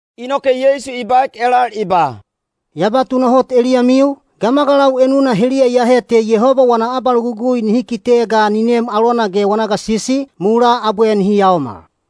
Inoke Yeisu i baek elal i ba, “Ya ba tunahot eliyamiu, gamagalau enuna heliya iyahe te Yehoba wana abalogugui nihi kite ga ni nem alona ge wana gasisi, mulaa abwe nihi yaomal.”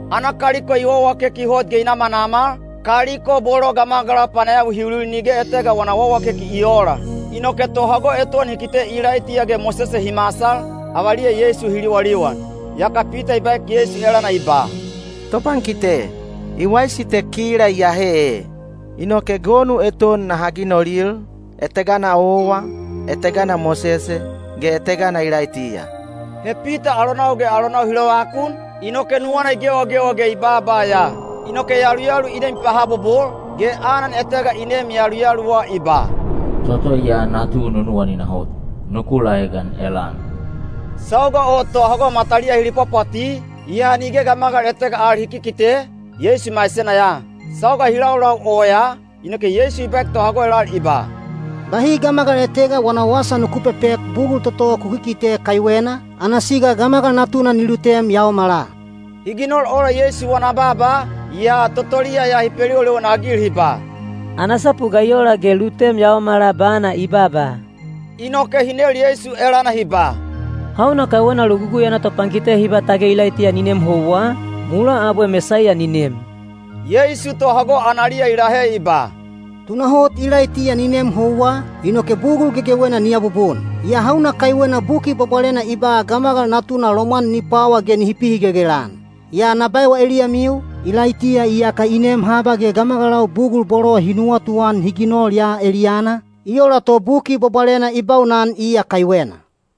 Ana kaliko i wawakeki hot ge i namanamal, kaliko bolo gamagalau panayawi hi ulil nige etega wana wawakeki i oola. Inoke tohago eton hi kite Ilaitiya ge Mosese hi masal, avaliya Yeisu hi liwaliwan. Yaka Pita i baek Yeisu elana i ba, “Topankite, i waisi te kila iyahe ee. Inoke gonu eton naha ginolil, etegana owa, etegana Mosese, ge etegana Ilaitiya.” He Pita alonau ge alonau hi lovakun, inoke nuwana i gewagewa ge i baaba ya. Inoke yaluyalu i nem i pahabobol, ge anan etega i neem yaluyaluwa i ba, “Toto ya natu nunuwanina hot. Nuku laegan elana.” Sauga o tohago mataliya hi lipwapwati, yaa nige gamagal etega al hi kikite, Yeisu maisena ya. Sauga hi laulau oyaa, inoke Yeisu i baek tohago elal i ba, “Bahi gamagal etega wana wasa nuku pepek bugul toto ku kikite kaiwena, ana siga Gamagal Natuna ni lutem yaomala.” Hi ginol ola Yeisu wana baaba, yaa totoliya ya hi peliwaliwan-agil hi ba, “Ana sapu ga i ola ge lutem yaomala bana i baaba?” Inoke hi nel Yeisu elana hi ba, “Hauna kaiwena Logugui ana topankite hi ba tage Ilaitiya ni nem houwa, mulaa abwe Mesaiya ni nem?” Yeisu tohago analiya i lahe i ba, “Tunahot Ilaitiya ni nem houwa, inoke bugul gegewena ni abubun. Yaa hauna kaiwena Buki Bwabwalena i ba Gamagal Natuna lomwan ni pwawa ge nihi pihigelgel-an? Yaa na ba eliyamiu, Ilaitiya iyaka i nem haba ge gamagalau bugul bolo hi nuwatuan hi ginol ya eliyana, i ola to Buki Bwabwalena i baunan iya kaiwena.”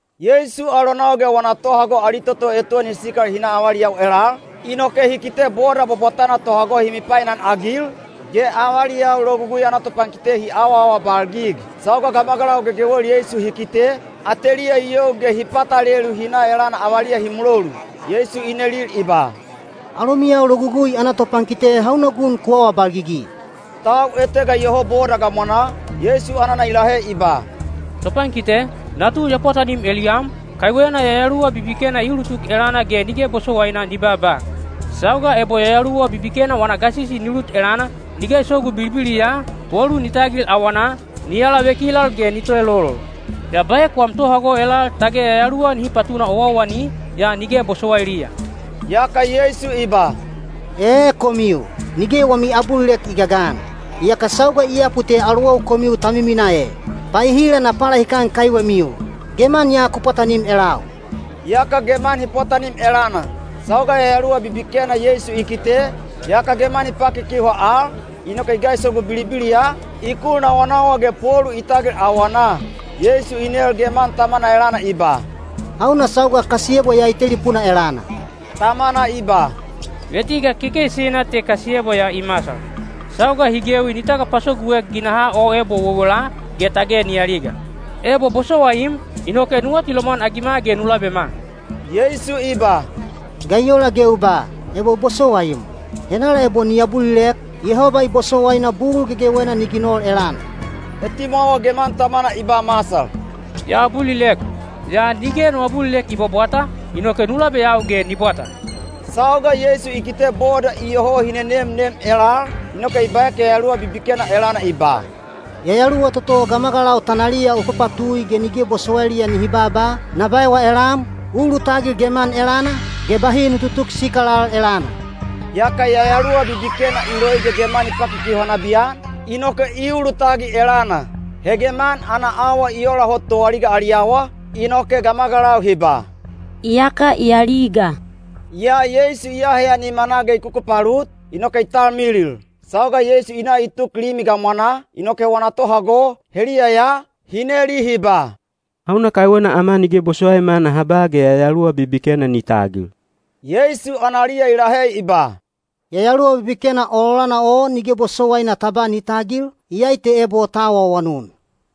Yeisu alonau ge wana tohago ali toto eton hi sikal hi na avaliyau elal, inoke hi kite boda bwabwatana tohago hi mipainan-agil, ge avaliyau Logugui ana topankite hi awaawabalgig. Sauga gamagalau gegewel Yeisu hi kite, ateliya i you ge hi patalelu hi na elana avaliya hi mulolu. Yeisu i nelil i ba, “Alomiyau Logugui ana topankite hauna gun ku awabalgigi?” Tau etega iyoho boda gamwanaa, Yeisu anana i lahe i ba, “Topankite, natu ya pwatanim eliyam, kaiwena yayaluwa bibikena i ulutuk elana ge nige bosowaina ni baaba. Sauga ebo yayaluwa bibikena wana gasisi ni lut elana, ni gaisogu bilibiliya, polu ni tagil awanaa, ni alavekilal ge ni toelolol. Ya baek wam tohago elal tage yayaluwa nihi patuna owaowani, yaa nige bosowailiya.” Yaka Yeisu i ba, “Ee komiu, nige wami abulilek i gagan! Iyaka sauga i yapu te alowau komiu ta miminaa e! Paehila na palahikan kaiwemiu? Geman ya ku pwatanim elau.” Yaka geman hi pwatanim elana. Sauga yayaluwa bibikena Yeisu i kite, yaka geman i pakikiuha al, inoke i gaisogu bilibiliya, i kul nawanawa ge polu i tagil awanaa. Yeisu i nel geman tamana elana i ba, “Hauna sauga kasiyebwa ya i telipuna elana?” Tamana i ba, “Vetiga kekeisina te kasiyebwa ya i masal. Sauga hi gewi ni tagapasoguek ginahaa o ebo wewela, ge tage ni aliga. Ebo bosowaim, inoke nu atilomwan-agima ge nu labema.” Yeisu i ba, “Ga i ola ge u ba, ‘Ebo bosowaim?’ Henala ebo ni abulilek, Yehoba i bosowaina bugul gegewena ni ginol elana.” Etimwawa geman tamana i ba masal, “Ya abulilek. Yaa nige no abulilek i bwabwata, inoke nu labeyau ge ni bwata.” Sauga Yeisu i kite boda iyoho hi nenemnem elal, inoke i baek yayaluwa bibikena elana i ba, “Yayaluwa toto gamagalau tanaliya u papatui ge nige bosowailiya nihi baaba, na baewa elam, u ulutagil geman elana, ge bahi nu tutuk sikal al elana!” Yaka yayaluwa bibikena i loi ge geman i pakikiuha nabiyan, inoke i ulutagil elana. He geman ana awa i ola hot toaliga ali awa, inoke gamagalau hi ba, “Iyaka i aliga.” Yaa Yeisu i aheya nimanaa ge i kukupalut, inoke i talmilil. Sauga Yeisu i na i tuk limi gamwanaa, inoke wana tohago, heliya ya, hi neli hi ba, “Hauna kaiwena ama nige bosowaima naha ba ge yayaluwa bibikena ni tagil?” Yeisu analiya i lahe i ba, “Yayaluwa bibikena ololana o nige bosowaina ta ba ni tagil, iyai te ebo ta awaawanun.”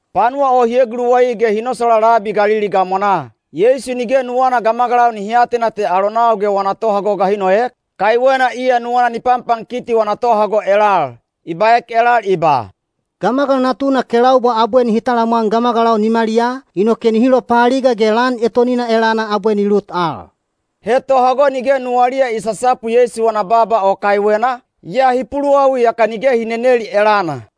Panuwa o hi eguluwai ge hi nosolaa labi Galili gamwanaa. Yeisu nige nuwana gamagalau nihi atena te alonau ge wana tohago ga hi noek, kaiwena iya nuwana ni panpankiti wana tohago elal. I baek elal i ba, “Gamagal Natuna kelaubwa abwe nihi talamwan gamagalau nimaliyaa, inoke nihi lopaaliga ge lan etonina elana abwe ni lut al.” He tohago nige nuwaliya i sasapu Yeisu wana baaba o kaiwena, yaa hi puluwawi yaka nige hi neneli elana.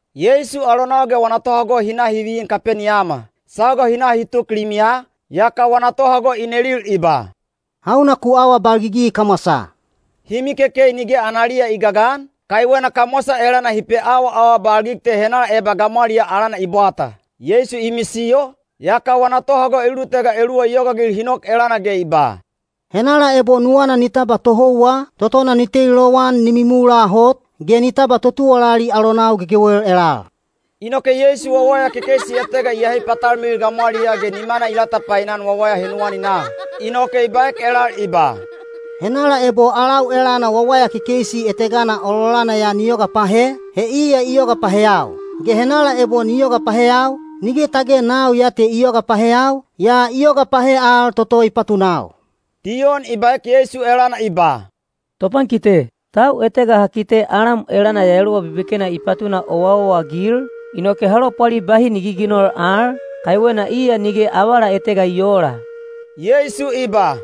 Yeisu alonau ge wana tohago hi na hi vin Kapeniyama. Sauga hi na hi tuk limiya, yaka wana tohago i nelil i ba, “Hauna ku awabalgigi kamwasaa?” Hi mikekei nige analiya i gagan, kaiwena kamwasa elana hi peawaawabalgig te henala eba gamwaliyaa alana i bwata. Yeisu i misiyo, yaka wana tohago elulutega eluwa i yogaagil hi nok elana ge i ba, “Henala ebo nuwana ni tabwa tohouwa, totona ni teli lowan ni mimula hot, ge ni tabwa totuwalali alonau gegewel elal.” Inoke Yeisu wawaya kekeisi etega i ahe i patalmilil gamwaliyaa ge nimana i latapainan wawaya henuwaninaa. Inoke i baek elal i ba, “Henala ebo alau elana wawaya kekeisi etegana ololana ya ni yoga pahe, he iya i yoga paheyau; ge henala ebo ni yoga paheyau, nige tage nau ya te i yoga paheyau, yaa i yoga pahe al toto i patunau.” Diyon i baek Yeisu elana i ba, “Topankite, tau etega ha kite alam elana yayaluwa bibikena i patuna owaowa-agil, inoke ha lopwali bahi ni giginol al, kaiwena iya nige avala etega i oola.” Yeisu i ba,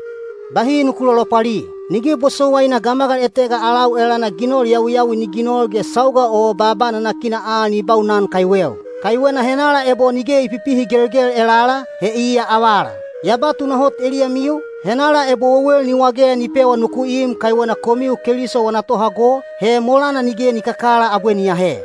“Bahi nuku lolopwali. Nige bosowaina gamagal etega alau elana ginol yawiyawi ni ginol ge sauga o baaba nanakina al ni baunan kaiweu. Kaiwena henala ebo nige i pipihigelgel elala, he iya avala. Ya ba tunahot eliyamiu, henala ebo wewel ni wage ni pewa nuku im kaiwena komiu Keliso wana tohago, he molana nige ni kakala abwe ni ahe.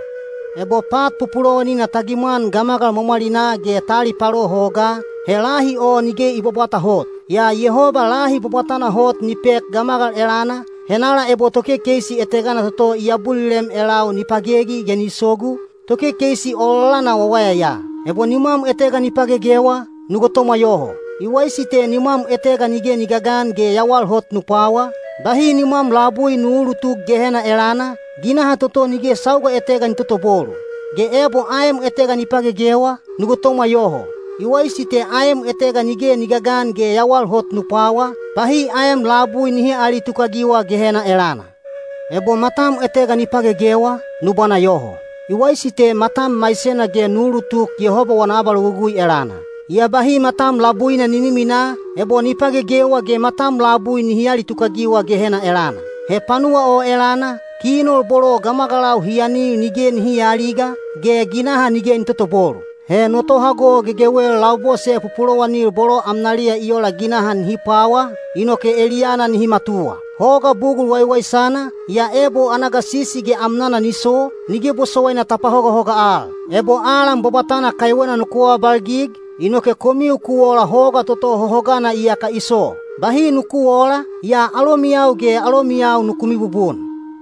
“Ebo pat pupulowanina ta gimwan gamagal mwamwalinaa ge ta alipalo hogaa, he lahi o nige i bwabwata hot. Yaa Yehoba lahi bwabwatana hot ni pek gamagal elana, henala ebo tokekeisi etegana toto i abulilem elau ni pagegi ge ni sogu, tokekeisi ololana wawaya ya. Ebo nimwam etega ni pagegewa, nu gotomwa yoho. I waisi te nimwam etega nige ni gagan ge yawal hot nu pwawa, bahi nimwam labui nu uulutuk Gehena elana, ginaha toto nige sauga etega ni totobolu. Ge ebo aem etega ni pagegewa, nu gotomwa yoho. I waisi te aem etega nige ni gagan ge yawal hot nu pwawa, bahi aem labui nihi aalitukagiwa Gehena elana. Ebo matam etega ni pagegewa, nu bwana yoho. I waisi te matam maisena ge nu ulutuk Yehoba wana abalogugui elana. Yaa bahi matam labuina ni miminaa, ebo ni pagegewa ge matam labui nihi alitukagiwa Gehena elana. He panuwa o elana, kinol bolo gamagalau hi anil nige nihi aaliga, ge ginaha nige ni totobolu. “He no tohago gegewel labose pupulowanil bolo amnaliya i ola ginaha nihi pwawa, inoke eliyana nihi matuwa. “Hoga bugul waiwaisana, yaa ebo ana gasisi ge amnana ni so, nige bosowaina ta pahogahoga al. Ebo alan bwabwatana kaiwena nuku awabalgig, inoke komiu ku ola hoga toto hohogana iyaka i so. Bahi nuku oola, yaa alomiyau ge alomiyau nuku mibubun.”